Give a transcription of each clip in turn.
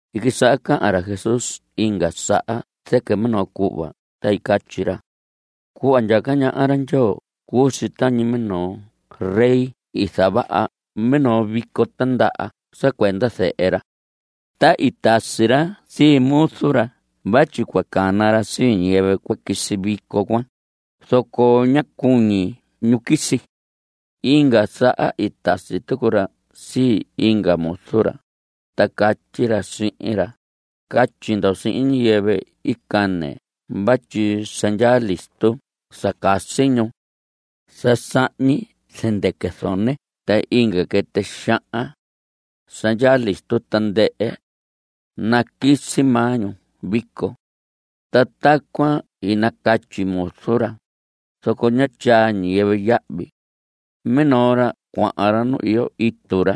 I quisaha cahan ra Jesús inga saha zɨquɨ minoo cuhva, ta i catyi ra: Cuhva ndyaca ñaha ra Ndyoo cuu si tañi minoo rey i zavaha minoo vico tindaha sa cuenda zehe ra. Ta i tasi ra sii muzu ra vatyi cua cana ra sii ñiyɨvɨ cua quisi vico cuan, zoco ñá cuñi ñu quisi. Inga saha i tasi tucu ra sii inga muzu ra, ta catyi ra sihin ra: “Catyi ndo sihin ñiyɨvɨ i cane vatyi sa ndyaa listo sa casi ñu. Sa sahñi zɨndɨquɨ zone ta inga quɨtɨ xahan. Sa ndyaa listo tandɨhɨ. Naquisi maa ñu vico.” Ta tacuan i nacatyi muzu ra, zoco ñá tyaa ñiyɨvɨ yahvi. Minoo ra cuahan ra nu iyo itu ra,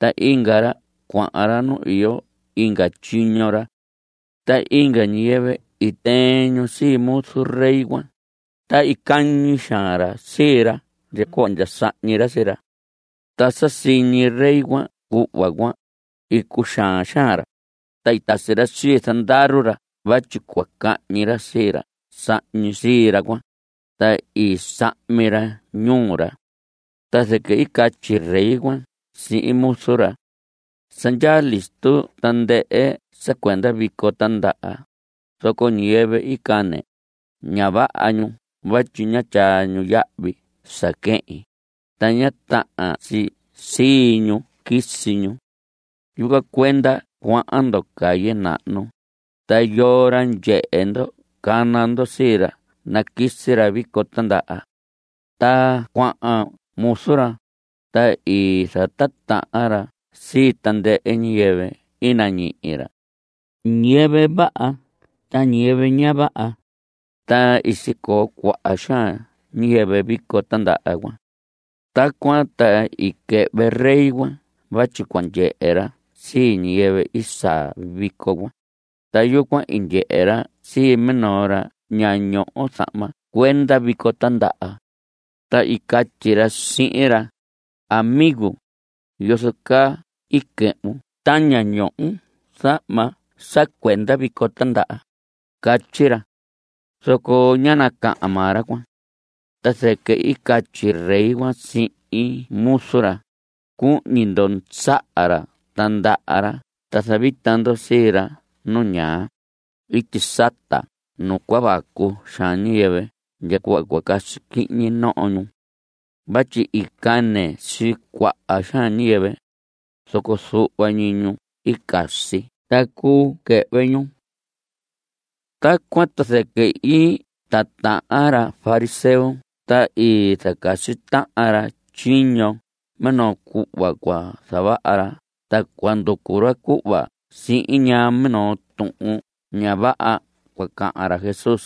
ta inga ra cuahan ra nu iyo inga tyiño ra. Ta inga ñiyɨvɨ i tɨɨn sii muzu rey cuan, ta i cañi xaan ra sii ra ndya cuhva ndya sahñi ra sii ra. Ta sa siñi rey cuan cuhva cuan, i cuxaan xaan ra, ta i tasi ra sii zandaru ra vatyi cua cahñi ra sii ra sahñi sii ra cuan, ta i sahmi ra ñuu ra. Ta zɨquɨ i catyi rey cuan sihin muzu ra: “Sa ndyaa listo tandɨhɨ sa cuenda vico tindaha, zoco ñiyɨvɨ i cane, ña vaha ñu vatyi ñá tyaa ñu yahvi sa quehin, ta ña tahan si sii ñu quisi ñu. Yucuan cuenda cuahan ndo calle nahnu, ta yoo ra ndyehe ndo cana ndo sii ra naquisi ra vico tindaha.” Ta cuahan muzu ra, ta i zatitahan ra sii tandɨhɨ ñiyɨvɨ i nañihi ra, ñiyɨvɨ vaha ta ñiyɨvɨ ña vaha, ta i sicoo cuaha xaan ñiyɨvɨ vico tindaha cuan. Tacuan ta i quɨhvɨ rey cuan vatyi cua ndyehe ra sii ñiyɨvɨ i saa vico cuan, ta yucuan i ndyehe ra sii minoo ra ña ñoho zahma cuenda vico tindaha. Ta i catyi ra sihin ra: “Amigo, ¿yozo caa i quɨhvun ta ña ñohon zahma sa cuenda vico tindaha?” Catyi ra. Zoco ñá nacahan maa ra cuan. Ta zɨquɨ i catyi rey cuan sihin muzu ra: “Cuhñi ndo saha ra ta ndaha ra ta zavita ndo sii ra nu ñaa, ityi sata nu cua vacu xaan ñiyɨvɨ ndya cuhva casi quihñi noho ñu. Vatyi i cane sii cuaha xaan ñiyɨvɨ, zoco zuhva ñi ñu i casi ta cuu quɨhvɨ ñu.” Tacuan ta zɨquɨ i titahan ra fariseo ta i zacasi tahan ra tyiño minoo cuhva cua zavaha ra ta cua nducu ra cuhva sihin ñaa minoo tuhun ña vaha cua cahan ra Jesús,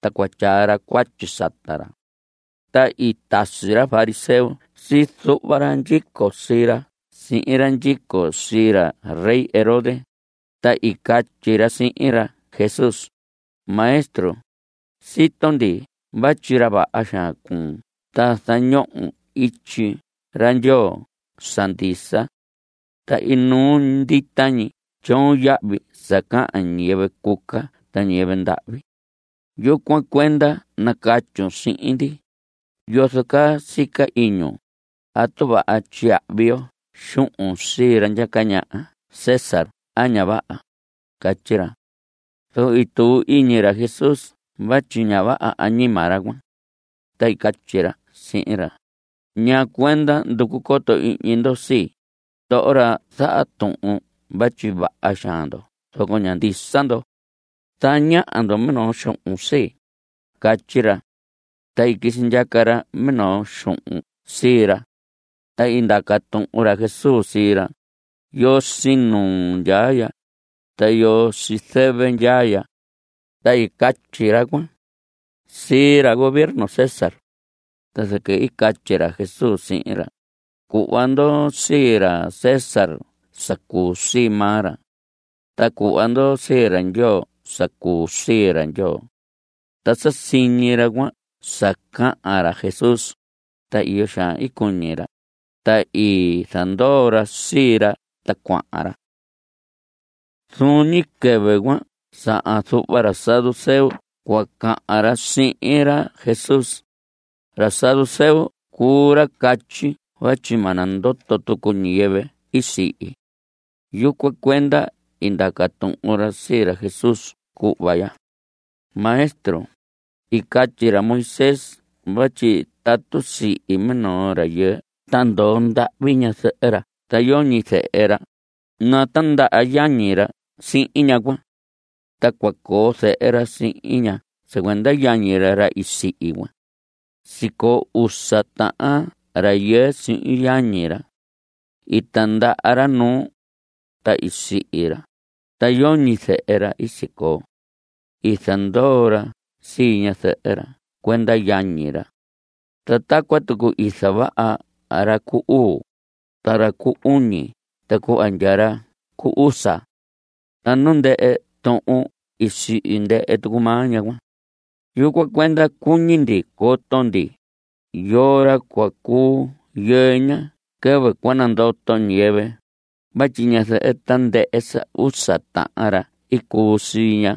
ta cua tyaa ra cuatyi sata ra. Ta i tasi ra fariseo sii zuhva ra ndyico sii ra sihin ra ndyico sii ra rey Herodes, ta i catyi ra sihin ra Jesús: Maestro, sito ndi vatyi ra vaha xaan cuun ta zañohon ityi ra Ndyoo sa ndisa. Ta inuu ndita ñi tyoon yahvi sa cahan ñiyɨvɨ cuca ta ñiyɨvɨ ndahvi. Yucuan cuenda nacatyun sihin ndi, ¿yozo caa sica iñun? ¿Atu vaha tyiyahvi yo xuhun sii ra ndyaca ñaha César a ña vaha? Catyi ra. Zoco i tuu iñi ra Jesús vatyi ña vaha añima ra cuan. Ta i catyi ra sihin ra: ¿Ñaa cuenda nducu coto ihñi ndo sii? ndoho ra zaha tuhun vatyi vaha xaan ndo zoco ña ndisa ndo. Zañaha ndo minoo xuhun sii. Catyi ra. Ta i quisi ndyaca ra minoo xuhun sii ra. Ta i ndaca tuhun ra Jesús sii ra: ¿Yoo sii nuu ndyaa ya? ¿Ta yoo sii zɨvɨ ndyaa ya? Ta i catyi ra cuan. Sii ra gobierno César. Ta zɨquɨ i catyi ra Jesús sihin ra: Cuhva ndo sii ra César sa cuu sii maa ra. Ta cuhva ndo sii ra Ndyoo sa cuu sii ra Ndyoo. Ta sa siñi ra cuan sa cahan ra Jesús, ta iyo xaan i cuñi ra, ta i zandoo ra sii ra ta cuahan ra. Zuun ñi quɨvɨ cuan sahan zuhva ra saduceo cua cahan ra sihin ra Jesús. Ra saduceo cuu ra catyi vatyi ma nandoto tucu ñiyɨvɨ i sihi. Yucuan cuenda i ndaca tuhun ra sii ra Jesús cuhva ya: Maestro, i catyi ra Moisés vatyi tatu sihi minoo rayɨɨ ta ndoo ndahvi ñazɨhɨ ra ta yoñi zehe ra, natindaha yañi ra sihin ñaha cuan. Ta cua coo zehe ra sihin ña sa cuenda yañi ra, ra i sihi cuan. Sicoo usa tahan rayɨɨ sihin yañi ra. I tindaha ra nuu. Ta i sihi ra, ta yoñi zehe ra i sicoo. I zandoo ra sii ñazɨhɨ ra cuenda yañi ra. Ta tacuan tucu i zavaha ra cu uu, ta ra cu uñi ta cuhva ndya ra cu usa. Ta nu ndɨhɨ tuhun i sihi ndɨhɨ tucu maa ñaha cuan. Yucuan cuenda cuñi ndi coto ndi, ¿yoo ra cua cuu yɨɨ ña quɨvɨ cua nandoto ñiyɨvɨ? vatyi ñazɨhɨ tandɨhɨ sa usa tahan ra i cuu sii ña.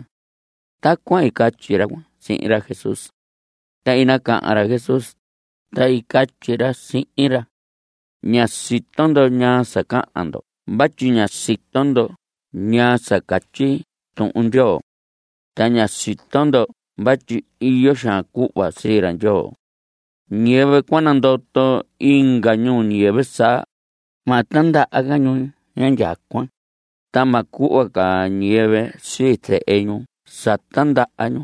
Tacuan i catyi ra cuan sihin ra Jesús. Ta i nacahan ra Jesús, ta i catyi ra sihin ra: Ña sito ndo ñaa sa cahan ndo vatyi ña sito ndo ñaa sa catyi Tuhun Ndyoo. Ta ña sito ndo vatyi iyo xaan cuhva sii ra Ndyoo. Ñiyɨvɨ cua nandoto inga ñuu ñiyɨvɨ saa, ma tindaha ca ñu indyacuan, ta ma cuhva ca ñiyɨvɨ sii zehe ñu sa tindaha ñu.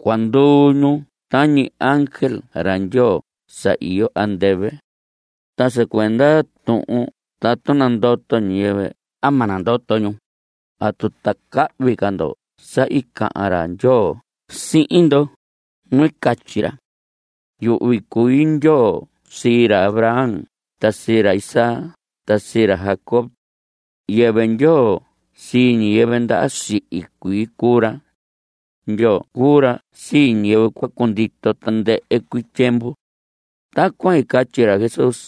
Cua nduu ñu tañi ángel ra Ndyoo sa iyo andɨvɨ. Ta sa cuenda tuhun tatu nandoto ñiyɨvɨ a ma nandoto ñu, ¿atu ta cahvi ca ndo sa i cahan ra Ndyoo sihin ndo? nu i catyi ra: “Yuhvi cui Ndyoo sii ra Abraham ta sii ra Isaac ta sii ra Jacob.” Yɨvɨ Ndyoo sii ñiyɨvɨ ndaha sihi cuii cuu ra. Ndyoo cuu ra sii ñiyɨvɨ cua cundito tandɨhɨ cuii tyiemvu. Tacuan i catyi ra Jesús,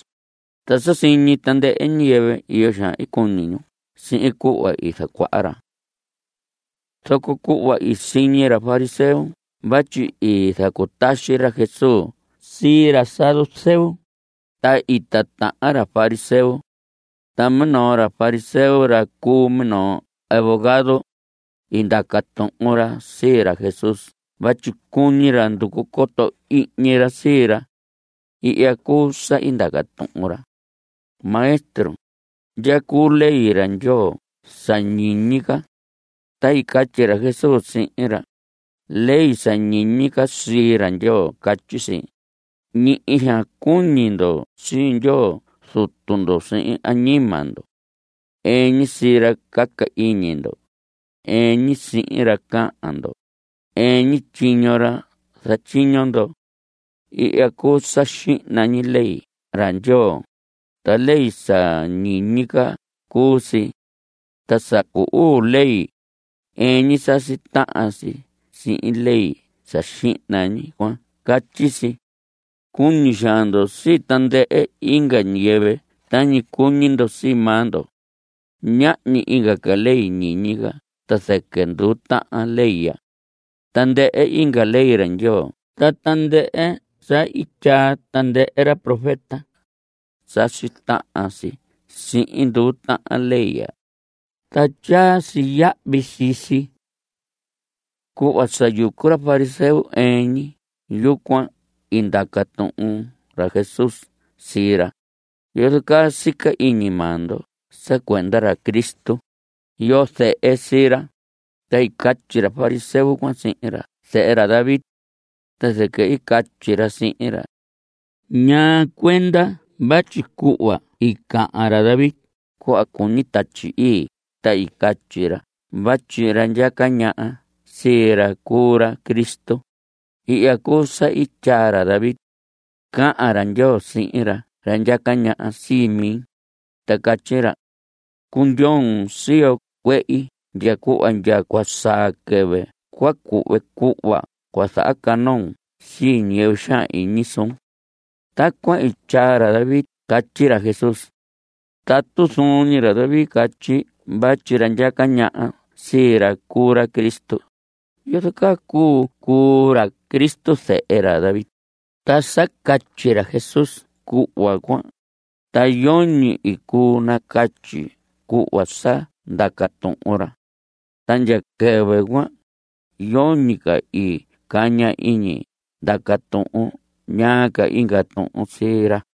ta sa siñi tandɨhɨ ñiyɨvɨ, iyo xaan i cuñi ñu sihin cuhva i zacuaha ra. Zoco cuhva i siñi ra fariseo vatyi i zacutaxi ra Jesús sii ra saduceo, ta i titahan ra fariseo. Ta minoo ra fariseo, ra cu minoo abogado, i ndaca tuhun ra sii ra Jesús vatyi cuñi ra nducu coto ihñi ra sii ra. Ihya cuu sa ndaca tuhun ra: Maestro, ¿ndya cuu ley ra Ndyoo sa ñiñi ca? Ta i catyi ra Jesús sihin ra: Ley sa ñiñi ca sii ra Ndyoo catyi si: “Nihi xaan cuñi ndo sii Ndyoo Zutu ndo sihin añima ndo. Ɨɨn ñi sii ra caca iñi ndo; ɨɨn ñi sihin ra cahan ndo; ɨɨn ñi tyiño ra zatyiño ndo.” Ihya cuu sa xihna ñi ley ra Ndyoo, ta ley sa ñiñi ca cuu si. Ta sa cu uu ley, ɨɨn ñi sasi tahan si sihin ley sa xihna ñi cuan. Catyi si: “Cuñi xaan ndo sii tandɨhɨ inga ñiyɨvɨ tañi cuñi ndo sii maa ndo.” Ñahñi inga ca ley ñiñi ca ta zɨquɨ nduu tahan ley ya. Tandɨhɨ inga ley ra Ndyoo ta tandɨhɨ sa i tyaa tandɨhɨ ra profeta, sasi tahan si sihin nduu tahan ley ya, ta tyaa si yahvi sii si. Cuhva sa yucu ra fariseo ɨɨn ñi yucuan i ndaca tuhun ra Jesús sii ra: ¿Yozo caa sica iñi maa ndo sa cuenda ra Cristo? ¿Yoo zehe sii ra? Ta i catyi ra fariseo cuan sihin ra: Zehe ra David. Ta zɨquɨ i catyi ra sihin ra: ¿Ñaa cuenda vatyi cuhva i cahan ra David cuhva cuñi Tatyi Ii ta i catyi ra vatyi ra ndyaca ñaha sii ra cuu ra Cristo? Ihya cuu sa i tyaa ra David: Cahan ra Ndyoo sihin ra ndyaca ñaha sii mi, ta catyi ra: “Cundyoon siyo cuehi ndya cuhva ndya cua saa quɨvɨ cua cuhve cuhva cua zahacanoon sii ñiyɨvɨ xaan iñi suun.” Tacuan i tyaa ra David catyi ra Jesús. Tatu zuun ñi ra David catyi vatyi ra ndyaca ñaha sii ra cuu ra Cristo, ¿yozo caa cuu cuu ra Cristo zehe ra David? Ta sa catyi ra Jesús cuhva cuan, ta yoñi i cuu nacatyi cuhva sa ndaca tuhun ra. Ta ndya quɨvɨ cuan, yoñi ca i caña iñi ndaca tuhun ñaa inga tuhun sii ra.